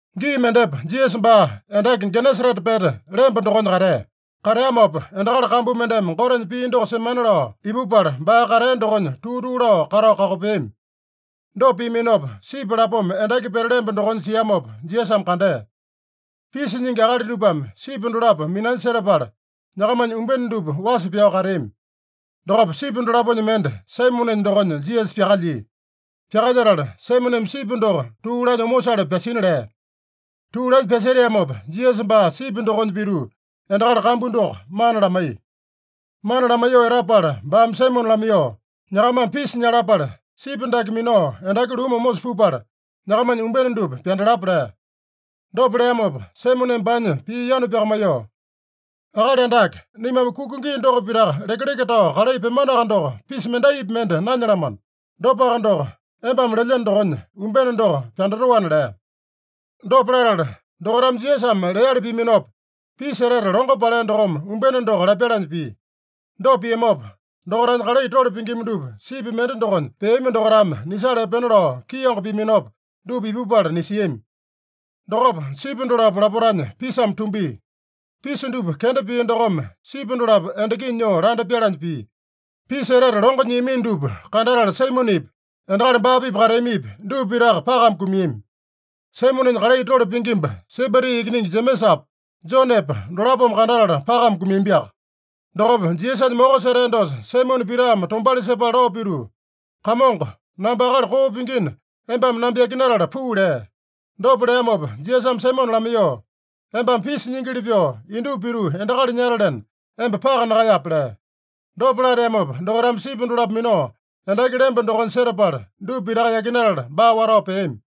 Gii mendepa Jisasa baa endaki Genesarete pete lemba dokonya katea. Kateamopa endakali kambu mendeme Gotenya pii doko semana lao ipupala, baa katea dokonya tuu-tuu lao katao kakopeami. Dopa piaminopa, sipi lapoma endaki pete lemba dokonya siamopa Jisasame kandea. Pisa nyingi akali dupame sipi dolapo minanya setapala, nyakamanya umbene dupa wasa pyao kateami. Dokopa sipi dolaponya mende, Saimonenya dokonya Jisasa pyakalyia. Pyakalyetala, Saimoneme sipi doko tuu lanya omosale pyasina lea. Tuu lanya pyaseteamopa, Jisasa baa sipi dokonya pituu endakali kambu doko mana lamaiya. Mana lamaiyoo etapala baame Saimone lamaiyoo, “Nyakamame pisa nyalapale, sipi dake minao endaki lumu omosa pupala, nyakamanya umbene dupa pyandalapa” lea. Dopa leamopa Saimoneme baanya pii yanu pyakamaiyoo, “Akali Andake, naimame kuka gii doko pitaka lekeleke tao kalai pyemanoaka doko, pisa mendaipi mende nanyalamano. Dopaka doko, embame lelyeno dokonya, umbene doko pyandatoana” lea. Dopa latala, dokaitame Jisasame leali piaminopa, pisa etete longo palea dokome umbene doko lapyalanya pia. Dopa piamopa, dokaitanya kalai tole pingima dupa, sipi mende dokonya peami dokaitame nisala epena lao kiango piaminopa, dupa ipupala nisiami. Dokopa sipi dolapo lapotanya pisame tumbia. Pisa dupa kenda pia dokome sipi dolapo endakinya nyoo landa pyalanya pia. Pisa etete longo nyiamino dupa kandatala Saimonepi, endakali baa-pipa kateamipi, dupa pitaka pakame kumiami. Saimonenya kalai tole pingimba, Sebedi ikiningi Jemesapa, Jonepa dolapome kandatala pakame kumiambiaka. Dokopa Jisasanya moko setea dosa Saimone Pitame tombauli sepala lao pituu, “Kamongo, namba akali koo pingina, embame namba yakinatala puu” lea. Dopa leamopa Jisasame Saimone lamaiyoo, “Embame pisa nyingili pyoo, indupa pituu endakali nyatalena, emba paka nakaeyape” lea. Dopa lateamopa, dokaitame sipi dolapo minao endaki lemba dokonya setapala, dupa pitaka yakinatala, baa watao peami.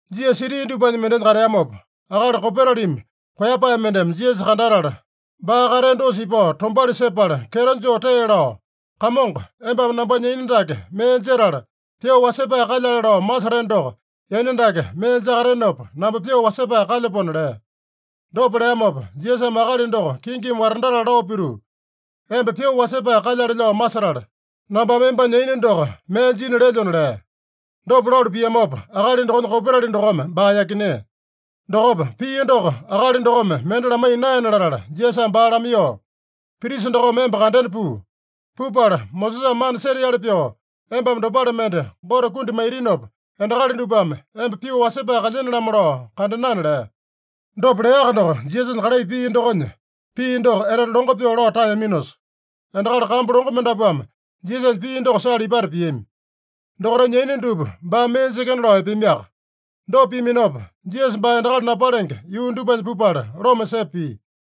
Jisasa siti dupanya mendenya kateamopa, akali kopetalimi koeyapae mendeme Jisasa kandatala, baa katea dosa ipao tombauli sepala, kyeto joo tee lao, “Kamongo, embame nambanya yaina dake mee jetala, pyoo wasepae kalyale lao maseteno doko, yaina dake mee jakatenopa, namba pyoo wasepae kalyapona” lea. Dopa leamopa, Jisasame akali doko kingimi watandatala lao pituu, “Emba pyoo wasepae kalyale lao masetala, nambame embanya yaina doko mee jina lelyona” lea. Dopa lalu piamopa, akali dokonya kopetali dokome baa yakinea. Dokopa, pia doko akali dokome mende lamaiya naena latala, Jisasame baa lamaiyoo, “Prisa dokome emba kandena puu. Pupala Mosesame mana seteali pyoo embame dopale mende Gote kundi maitinopa, endakali dupame emba pyoo wasepae kalyene-lamo lao kandenana” lea. Dopa leaka doko, Jisasanya kalai pia dokonya pii doko etete longo pyoo lao taeyaminosa, endakali kambu longo mendapuame Jisasanya pii doko sala ipata piami. Dokaitanya yaina dupa baame mee jekena lao epeamiaka. Dopa piaminopa, Jisasa baa endakali napalenge yuu dupanya pupala loma sepa pia.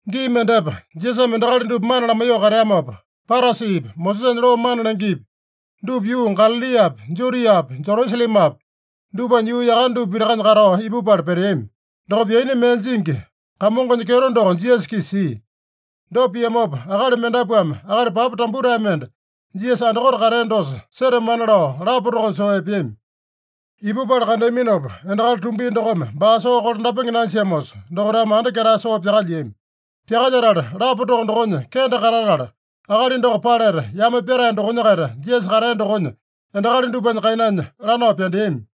Gii mendepa, Jisasame endakali dupa mana lamaiyoo kateamopa, Parasipi, Mosesanya loo mana lengepi dupa yuu Galaliapi, Judiapi, Jerusalemapi dupanya yuu yakane dupa pitakanya katao ipupala peteami. Dokopa yaina mee jingi, Kamongonya kyeto doko Jisasa-kisa sia. Dopa piamopa, akali mendapuame akali papa tambutae mende Jisasa andakote katea dosa setamana lao lapa tokonya soo epeami. Ipupala kandeaminopa, endakali tumbia dokome baa soo kolandapenge nanjiamosa, dokaitame anda ketae soo pyakalyiami. Pyakalyetala, lapa toko dokonya kende katatala, akali doko paleta yame pyatae dokonya-kaita Jisasa katea dokonya, endakali dupanya kainanya lanao pyandeami.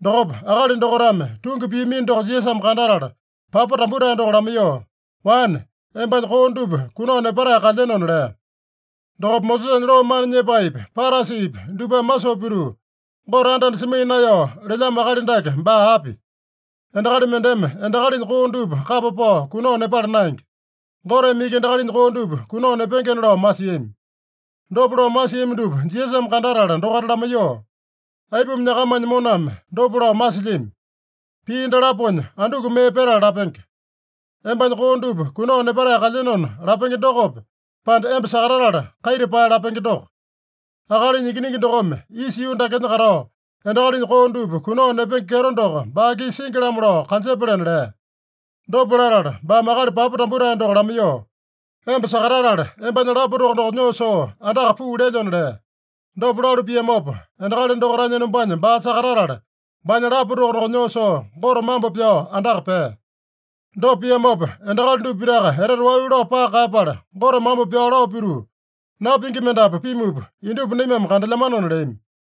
Dokopa akali dokaitame tungi piamino doko Jisasame kandatala, papa tambutae doko lamaiyoo, “Wane, embanya koo dupa kunao nepatae kalyenona” lea. Dokopa Mosesanya loo mana nyepaepi, Parasipi dupame masoo pituu, “Gote anda-anda semaiya naeyao lelyamo akali dake baa api? Endakali mendeme endakalinya koo dupa kapa pao kunao nepala naenge. Goteme iki endakalinya koo dupa kunao nepengena” lao masiami. Dopa lao masiami dupa Jisasame kandatala dokaita lamaiyoo, “Aipuma nyakamanya moname dopa lao masilyami? Pii dalaponya anduku mee petala lapenge? ‘Embanya koo dupa kunao nepatae kalyenona’ lapenge dokope, pande, ‘Emba sakatatala kaita pae’ lapenge doko? Akalinya Ikiningi dokome isa yuu dakenya katao, endakalinya koo dupa kunao nepenge kyeto doko baa-kisa singi-lamo lao kanjepalena” lea. Dopa latala baame akali papa tambutae doko lamaiyoo, “Emba sakatatala, embanya lapa toko doko nyoo soo andaka puu lelyona” lea. Dopa lalu piamopa, endakali dokaitanya enombanya baa sakatatala, baanya lapa toko doko nyoo soo, Gote mambo pyao andaka pea. Dopa piamopa, endakali dupa pitaka etete walu lao paka kaeyapala, Gote mambo pyao lao pituu, “Napingi mendapu pimupa indupa naimame kandelyamanona” leami.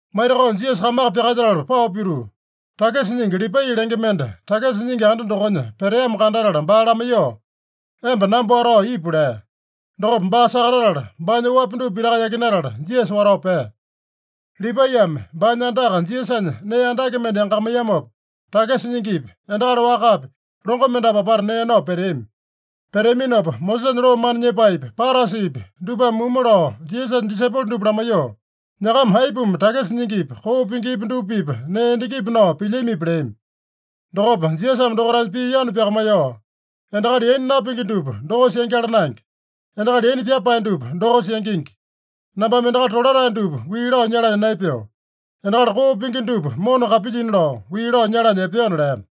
Maitakao Jisasa kamaka pyakalyetala pao pituu, takisa nyingi Lipai lenge mende takisa nyingi anda dokonya peteamo kandatala baa lamaiyoo, “Emba namba watao ipu” lea. Dokopa baa sakatatala, baanya oapi dupa pitaka yakinatala, Jisasa watao pea. Lipaiyame baanya andaka Jisasanya nee andake mende yangakamaiyamopa, takisa nyingipi, endakali wakapi longo mendapu apata nee nao peteami. Peteaminopa, Mosesanya loo mana nyepaepi, Parasipi dupame mumu lao Jisasanya disaipolo dupa lamaiyoo, “Nyakama aipuma takisa nyingipi, koo pingipi dupa-pipa nee endakipi nao pilyamipi?” leami. Dokopa Jisasame dokaitanya pii yanu pyakamaiyoo, “Endakali yaina napingi dupa dokosa yangyala naenge. Endakali yaina pyapae dupa dokosa yangingi. Nambame endakali tolatae dupa wii lao nyalanya naepeo. Endakali koo pingi dupa mona kapilyina lao, wii lao nyalanya epeona” lea.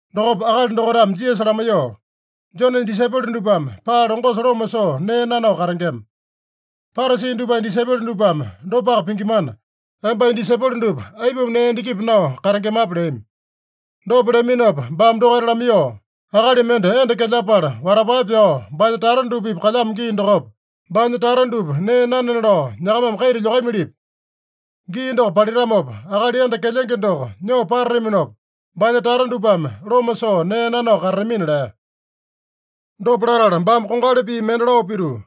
Dokopa akali dokaitame Jisasa lamaiyoo, “Jonenya disaipolo dupame paa longosa loma soo nee nanao katengema. Parasi dupanya disaipolo dupame dopaka pingimana, embanya disaipolo dupa aipuma nee endakipi nao katengemape?” leami. Dopa leaminopa baame dokaita lamaiyoo, “Akali mende enda kelyapala watapae pyao, baanya tata dupa-pipa kalyamo gii dokopa, baanya tata dupa nee nanena lao nyakamame kaita lyokamilipi? Gii doko palitamopa, akali enda kelyenge doko nyoo patataminopa, baanya tata dupame loma soo nee nanao katatamina” lea. Dopa latala baame kongali pii mende lao pituu,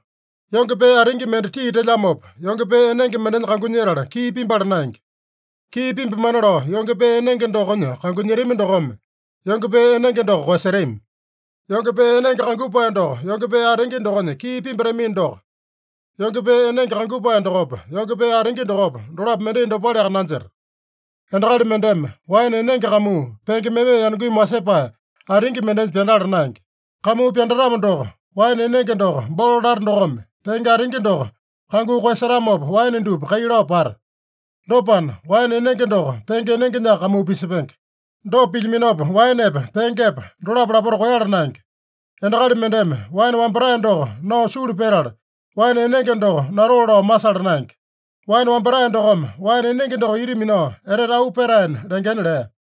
“Yonge pee atingi mende tii telyamopa, yonge pee enenge mendenya kangunyetala kii pimbala naenge. Kii pimbamana lao yonge pee enenge dokonya kangunyetami dokome, yonge pee enenge doko koeyasetami. Yonge pee enenge kangupae doko yonge pee atingi dokonya kii pimbatamino doko, yonge pee enenge kangupae dokopa, yonge pee atingi dokopa, dolapo mendai dopaleaka nanjeta. Endakali mendeme waene enenge kamuu, penge meme yanungimi wasepae atingi mendenya pyandala naenge. Kamuu pyandatamo doko, waene enenge doko bolo lata dokome, penge atingi doko kanguu koeyasetamopa, waene dupa kai lao pata. Dopana, waene enenge doko penge enengenyaka kamuu pisepenge. Dopa pilyaminopa, waenepa, pengepa dolapo lapota koeyala naenge. Endakali mendeme waene wambatae doko nao sulu petala, waene enenge doko natoo lao masala naenge. Waene wambatae dokome waene enenge doko ita minao etete auu petaena lengena” lea.